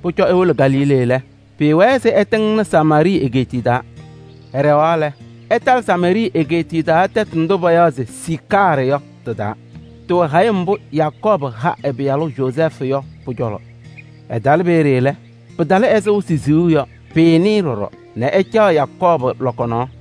Pʋcɔ ewolo Galilee lɛ, pɩɩwɛɛ se ɛtɩŋnɩ Samaarɩɩ egeetiye taa. Ɛɖɛɣaɣ lɛ, ɛtalɩ Samaarɩɩ egeetiye taa tɛtʋ ndʋ payaɣ se Siicaarɩ yɔ tɩ-taa. Tɩwɛ hayɩm mbʋ Yakɔɔbʋ ha ɛ-pɩyalʋ Yozɛɛfʋ yɔ pʋ-cɔlɔ. Ɛtalɩ peeye lɛ, pɩtalɩ ɛzɩ wɩsɩ siɣu yɔ. Pɩɩnɩ-ɩ ɖɔɖɔ, nɛ ɛcaɣ Yakɔɔbʋ lɔkɔ nɔɔ.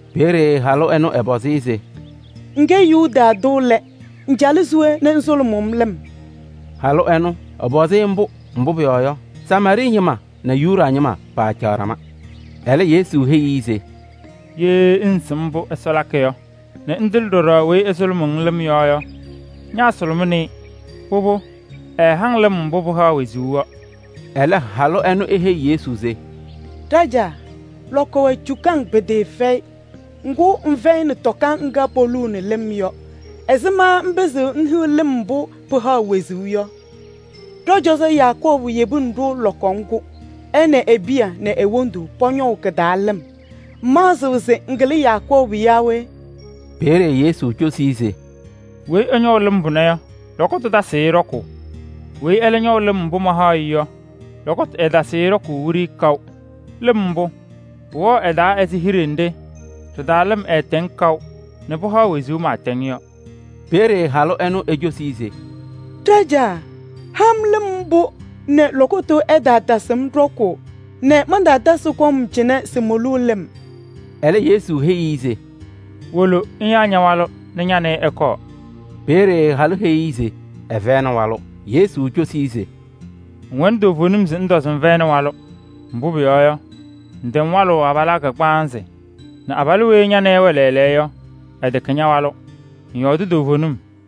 Peeye halʋ ɛnʋ ɛpɔzɩ-ɩ se: “Ŋkɛ Yuda tʋ lɛ, ŋcalɩ ña-taa se we nɛ ŋsʋlʋmʋʋ-m lɩm?” Halʋ ɛnʋ, ɛpɔzɩ-ɩ mbʋ, mbʋ pʋyɔɔ yɔ, Samaarɩɩ ñɩma nɛ Yuda ñɩma paacaɣ ɖama. Ɛlɛ Yesu heyi-i se: “Ye ŋŋsɩm mbʋ Ɛsɔ haɣ yɔ nɛ ŋtɩlɩ ɖɔɖɔ weyi ɛsʋlʋmʋʋ-ŋ lɩm yɔ yɔ, ñaasʋlʋmɩnɩ-ɩ, pʋbʋ ɛɛha-ŋ lɩm mbʋ pɩhaɣ wezuu yɔ.” Ɛlɛ halʋ ɛnʋ eheyi Yesu se: “Ɖajaa! Lɔkɔ wɛ cukaŋ pɩtɩɩfɛyɩ, ŋgʋ ŋfɛyɩnɩ tɔka ŋga poluuni lɩm yɔ. Ɛzɩma ŋpɩzɩɣ ŋhiɣ lɩm mbʋ pɩhaɣ wezuu yɔ? Ɖɔ-cɔzɔ Yakɔɔbʋ yebinini-ɖʋ lɔkɔ ŋgʋ. Ɛ nɛ e-piya nɛ e-wondu pɔñɔ kɩ-taa lɩm. Ŋmaɣzɩɣ se ŋkɩlɩ Yakɔɔbʋ yaa we?” Peeye Yesu cosi-i se: “Weyi ɛñɔʋ lɩm pʋnɛ yɔ, lɔkɔtʋ tasɩɣ-ɩ ɖɔkʋʋ. Weyi ɛlɛ ñɔʋ lɩm mbʋ ma mahaɣ-ɩ yɔ, lɔkɔtʋ ɛɛtasɩɣ-ɩ ɖɔkʋʋ wiɖiyi kaʋ. Lɩm mbʋ, pʋwɛɣ ɛ-taa ɛzɩ hiɖe nɖɩ ɖɩ-taa lɩm mbʋ pɩhaɣ wezuu pɩɩtɛŋ yɔ pɩlɩɣnɩ tam yɔ.” Peeye halʋ ɛnʋ ecosi-i se: “Ɖajaa! Ha-m lɩm mbʋ nɛ lɔkɔtʋ ɛtaatasɩ-m ɖɔkʋʋ nɛ mantasɩ kɔm cɩnɛ se moluu lɩm.” Ɛlɛ Yesu heyi-i se: “Wolo ŋyaa ña-walʋ nɛ ña nɛ ɩ ɩkɔɔ.” Peeye halʋ heyi-i se ɛfɛyɩnɩ walʋ. Yesu cosi-i se: “Ŋwɛnɩ toovenim se ŋtɔ se ŋfɛyɩnɩ walʋ, mbʋ pʋyɔɔ yɔ, ŋtɛm walʋʋ abalaa kagbaanzɩ nɛ abalʋ weyi ña nɛ ɩ ɩwɛ lɛɛlɛɛyɔ yɔ, ɛtɛkɛ ña-walʋ. Ŋyɔɔdɩ toovenim.”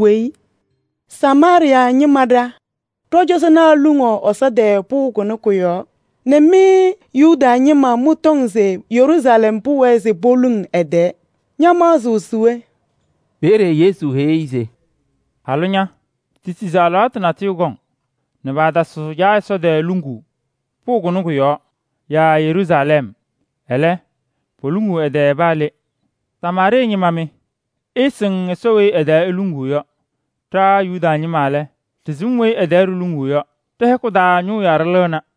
Welesi ŋnɩɩ, Samaarɩɩ ñɩma ɖa, ɖɔ-cɔzɔnaa luŋaɣ Ɛsɔ tɛɛ pʋʋ kʋnɛ kʋ-yɔɔ nɛ mɩ Yuda ñɩma mɩtɔŋ se Yeruusalɛm pʋwɛɛ se poluŋ ɛ-tɛɛ. Ña ñamaɣzɩɣ se we?” Peeye Yesu heyi-i se: “Halʋ ña! Tisi se alɩwaatʋ natʋyʋ kɔŋ nɛ paatasɩɣ Caa Ɛsɔ tɛɛ luŋuu pʋʋ kʋnɛ kʋ-yɔɔ yaa Yeruusalɛm. Ɛlɛ, poluŋuu ɛ-tɛɛ paa le. Samaarɩɩ ñɩma mɩ! Ɩɩsɩŋ Ɛsɔ weyi ɛ-tɛɛ iluŋuu yɔ. Ɖa Yuda ñɩma lɛ, ɖɩsɩm weyi ɛ-tɛɛ ɖiluŋuu yɔ: ɖɛ-hɛkʋ taa ñʋʋ yaɖʋ lɩɣna.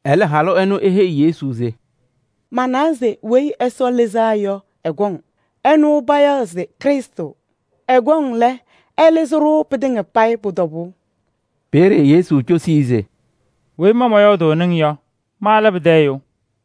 Ɛlɛ halʋ ɛnʋ eheyi Yesu se: “Manawa se Weyi Ɛsɔ Lɩzaa yɔ ɛkɔŋ, ɛnʋ payaɣ se Krɩstʋ. Ɛkɔŋ lɛ, ɛlɩzɩ-ɖʋ pɩtɩŋa payɩ pʋ-tɔbʋʋ.” Peeye Yesu cosi-i se: “Weyi ma mɔyɔɔdʋʋnɩ-ŋ yɔ, ma lɛ pɩtɛ ɛyʋ.”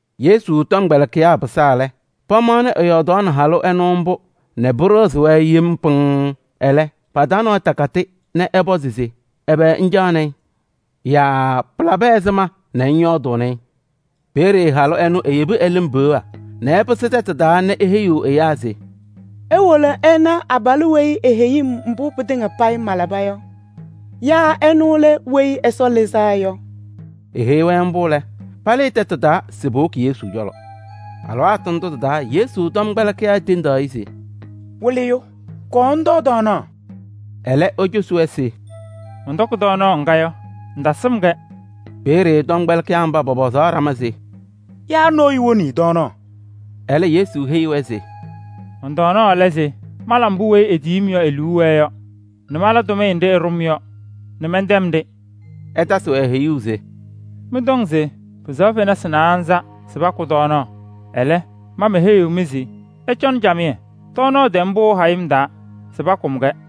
Yesu tɔmkpɛlɩkɩyaa pɩsaa lɛ, pamaɣnɩ ɛyɔɔdaɣnɩ halʋ ɛnʋ mbʋ nɛ pɩɖɩɣzɩ-wɛ yem pɩŋŋ. Ɛlɛ, pa-taa nɔɔyʋ takatɩ nɛ ɛpɔzɩ se: “Ɛbɛ ŋcaɣnɩ-ɩ?” yaa “Pɩlabɩ ɛzɩma nɛ ŋyɔɔdʋʋnɩ-ɩ?” Peeye halʋ ɛnʋ eyebi ɛ-lɩm peɣa nɛ ɛpɩsɩ tɛtʋ taa nɛ eheyiɣ ɛyaa se: “Iwolo ɩna abalʋ weyi eheyi-m mbʋ pɩtɩŋa payɩ malaba yɔ. Yaa ɛnʋ lɛ Weyi Ɛsɔ Lɩzaa Yɔ?” Eheyi-wɛ mbʋ lɛ, palɩɩ tɛtʋ taa se powoki Yesu cɔlɔ. Alɩwaatʋ ndʋ tɩ-taa Yesu tɔmkpɛlɩkɩyaa tendaɣ-ɩ se: “Wɩlɩyʋ! Kɔɔ ŋtɔɔ tɔɔnaɣ.” Ɛlɛ, ecosi-wɛ se: “Mɔntɔkɩ tɔɔnaɣ ŋga yɔ, ɩtasɩm-kɛ.” Peeye tɔmkpɛlɩkɩyaa mba pɔpɔzaɣ ɖama se: “Yaa nɔɔyʋ woni-i tɔɔnaɣ?” Ɛlɛ Yesu heyi-wɛ se: “Mɔn-tɔɔnaɣ lɛ se mala mbʋ weyi etiyi-m yɔ e-liu wɛɛ yɔ nɛ mala tʋmɩyɛ nɖɩ ɛɖʋ-m yɔ nɛ mɛntɛm-ɖɩ.” Ɛtasɩ-wɛ heyuu se: “Mɩ mɩtɔŋ se pɩsɛɣ fenasɩ naanza nɛ pakʋ tɔɔnaɣ, ɛlɛ, ma meheyiɣ-mɩ se ɩcɔnɩ camɩyɛ, tɔɔnaɣ tɛm pɩʋ hayɩm taa se pakʋm-kɛ.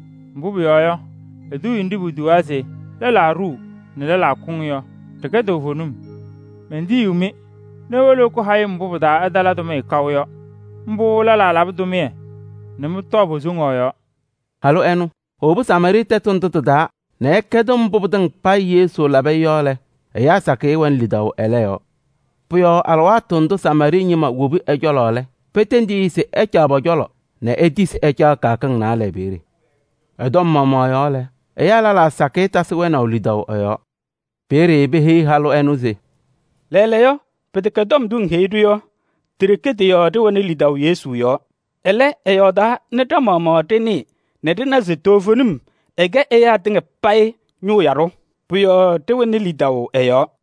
Mbʋ pʋyɔɔ yɔ, eduuye nɖɩ potuwaa se: ‘Lɛlaa ɖuu nɛ lɛlaa kʋŋ’ yɔ, ɖɩkɛ toovenim. Mentiyi-mɩ nɛ iwolo ɩkʋ hayɩm mbʋ pɩ-taa ɩtala tʋmɩyɛ kaʋ yɔ. Mbʋ lɛlaa labɩ tʋmɩyɛ nɛ mɩ mɩwaa pɔ-yɔɔ.” Halʋ ɛnʋ, ewobi Samaarɩɩ tɛtʋ ndʋ tɩ-taa nɛ ɛkɛdɩ mbʋ pɩtɩŋa payɩ Yesu labɩ-ɩ yɔ lɛ, ɛyaa sakɩyɛ wɛnɩ lidaʋ ɛlɛ yɔɔ. Pʋ-yɔɔ alɩwaatʋ ndʋ Samaarɩɩ ñɩma wobi ɛ-cɔlɔ lɛ, petendi-i se ɛcaɣ pɔ-cɔlɔ nɛ etisi ɛcaɣ kɩyakɩŋ naalɛ peeye. Ɛ-tɔm maɣmaɣ yɔɔ lɛ, ɛyaa lɛlaa sakɩyɛ tasɩ wɛnaʋ lidaʋ ɛ-yɔɔ. Peeye peheyi halʋ ɛnʋ se: “Lɛɛlɛɛyɔ, pɩtɛkɛ tɔm ndʋ ŋheyi-ɖʋ yɔ, ti-ɖeke tɩ-yɔɔ ɖɩwɛnɩ lidaʋ Yesu yɔɔ. Ɛlɛ, ɛyɔɔdaa nɛ ɖa-maɣmaɣ ɖɩnɩɩ nɛ ɖɩna se toovenim ɛkɛ ɛyaa tɩŋa payɩ ñʋʋ yaɖʋ, pʋ-yɔɔ ɖɩwɛnɩ lidaʋ ɛ-yɔɔ.”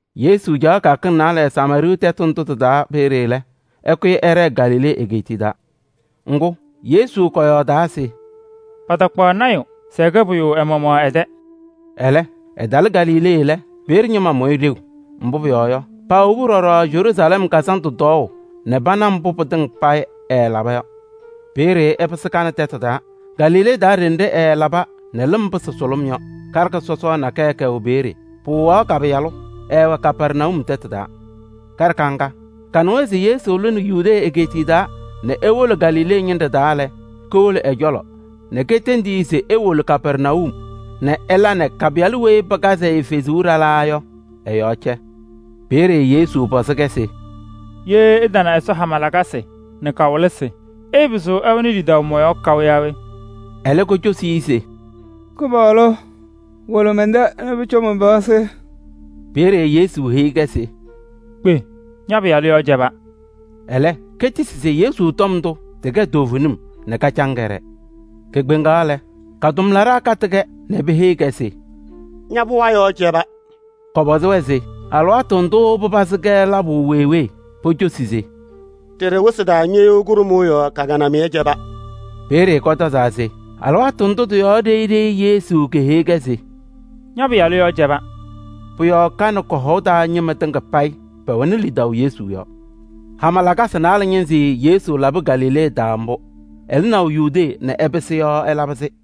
Yesu caɣ kɩyakɩŋ naalɛ Samaarɩɩ tɛtʋ ndʋ tɩ-taa peeye lɛ, ɛkʋyɩ ɛɖɛɛ Galilee egeetiye taa. Ŋgʋ, Yesu kɔyɔɔdaa se: “Patakpaɣ lɔɔyaɣ tʋ se ɛkɛ pʋyʋ ɛ-maɣmaɣ ɛ-tɛ.” Ɛlɛ, ɛtalɩ Galilee lɛ, peeye ñɩma mʋ-ɩ ɖeu. Mbʋ pʋyɔɔ yɔ, paawobi ɖɔɖɔ Yeruusalɛm kazandʋ tɔɔʋ nɛ pana mbʋ pɩtɩŋa payɩ ɛɛlaba yɔ. Peeye ɛpɩsɩ Kana tɛtʋ taa Galilee ɖenɖe ɛɛlaba nɛ lɩm pɩsɩ sʋlʋm yɔ. Karɩka sɔsɔɔ nakɛyɛ kɛwɛ peeye, pɩwɩɣaɣ ka-pɩyalʋ. Ɛɛwɛ Kapɛrnayum tɛtʋ taa. Karɩka ŋga, kanɩwa se Yesu lɩnɩ Yudee egeetiye taa nɛ ewolo Galilee ñɩnɖɛ taa lɛ, kowolo ɛ-cɔlɔ nɛ ketendi-i se ewolo Kapɛrnayum nɛ ɛla nɛ ka-pɩyalʋ weyi pɩkazɩ-ɩ fezuu ɖalaa yɔ, ɛ-yɔɔ cɛ. Peeye Yesu pɔzɩ-kɛ se: “Ye ɩtana Ɛsɔ hama lakasɩ nɛ kawɩlɩsɩ, ɩɩpɩzɩɣ ɩwɛnɩ lidaʋ mɔ-yɔɔ kaʋ yaa we?” Ɛlɛ kocosi-i se: “Kɩpaɣlʋ! Wolo mɛn-tɛ nɛ pʋcɔ man-pɩɣa sɩ.” Peeye Yesu heyi-kɛ se: “Kpe! Ña-pɩyalʋ yɔɔ cɛba.” Ɛlɛ ketisi se Yesu tɔm ndʋ tɩkɛ toovenim nɛ kacaŋ kɛɖɛɛ. Kekpeŋaɣ lɛ, ka-tʋmlaɖaa katɩ-kɛ nɛ peheyi-kɛ se: “Ña-pɩɣa yɔɔ cɛba!” Kɔpɔzɩ-wɛ se alɩwaatʋ ndʋʋ pɩpazɩ-kɛ labʋ wee wee? Pocosi se: “Ɖeɖe wɩsɩ taa ñɩɣyʋʋ kʋɖʋmʋʋ yɔɔ ka-kɩnamɩyɛ cɛba.” Peeye kɔtɔzaa se alɩwaatʋ ndʋ tɩ-yɔɔ ɖeyi ɖeyi Yesu keheyi-kɛ se: “Ña-pɩyalʋ yɔɔ cɛba.” Pʋ-yɔɔ ka nɛ kɔ-hɔʋ taa ñɩma tɩŋa payɩ pɛwɛnɩ lidaʋ Yesu yɔɔ. Hama lakasɩ naalɛ ñɩnzɩ Yesu labɩ Galilee ɛzʋnɔ. Ɛlɩnaʋ Yudee nɛ ɛpɩsɩ yɔ ɛlabɩ-sɩ.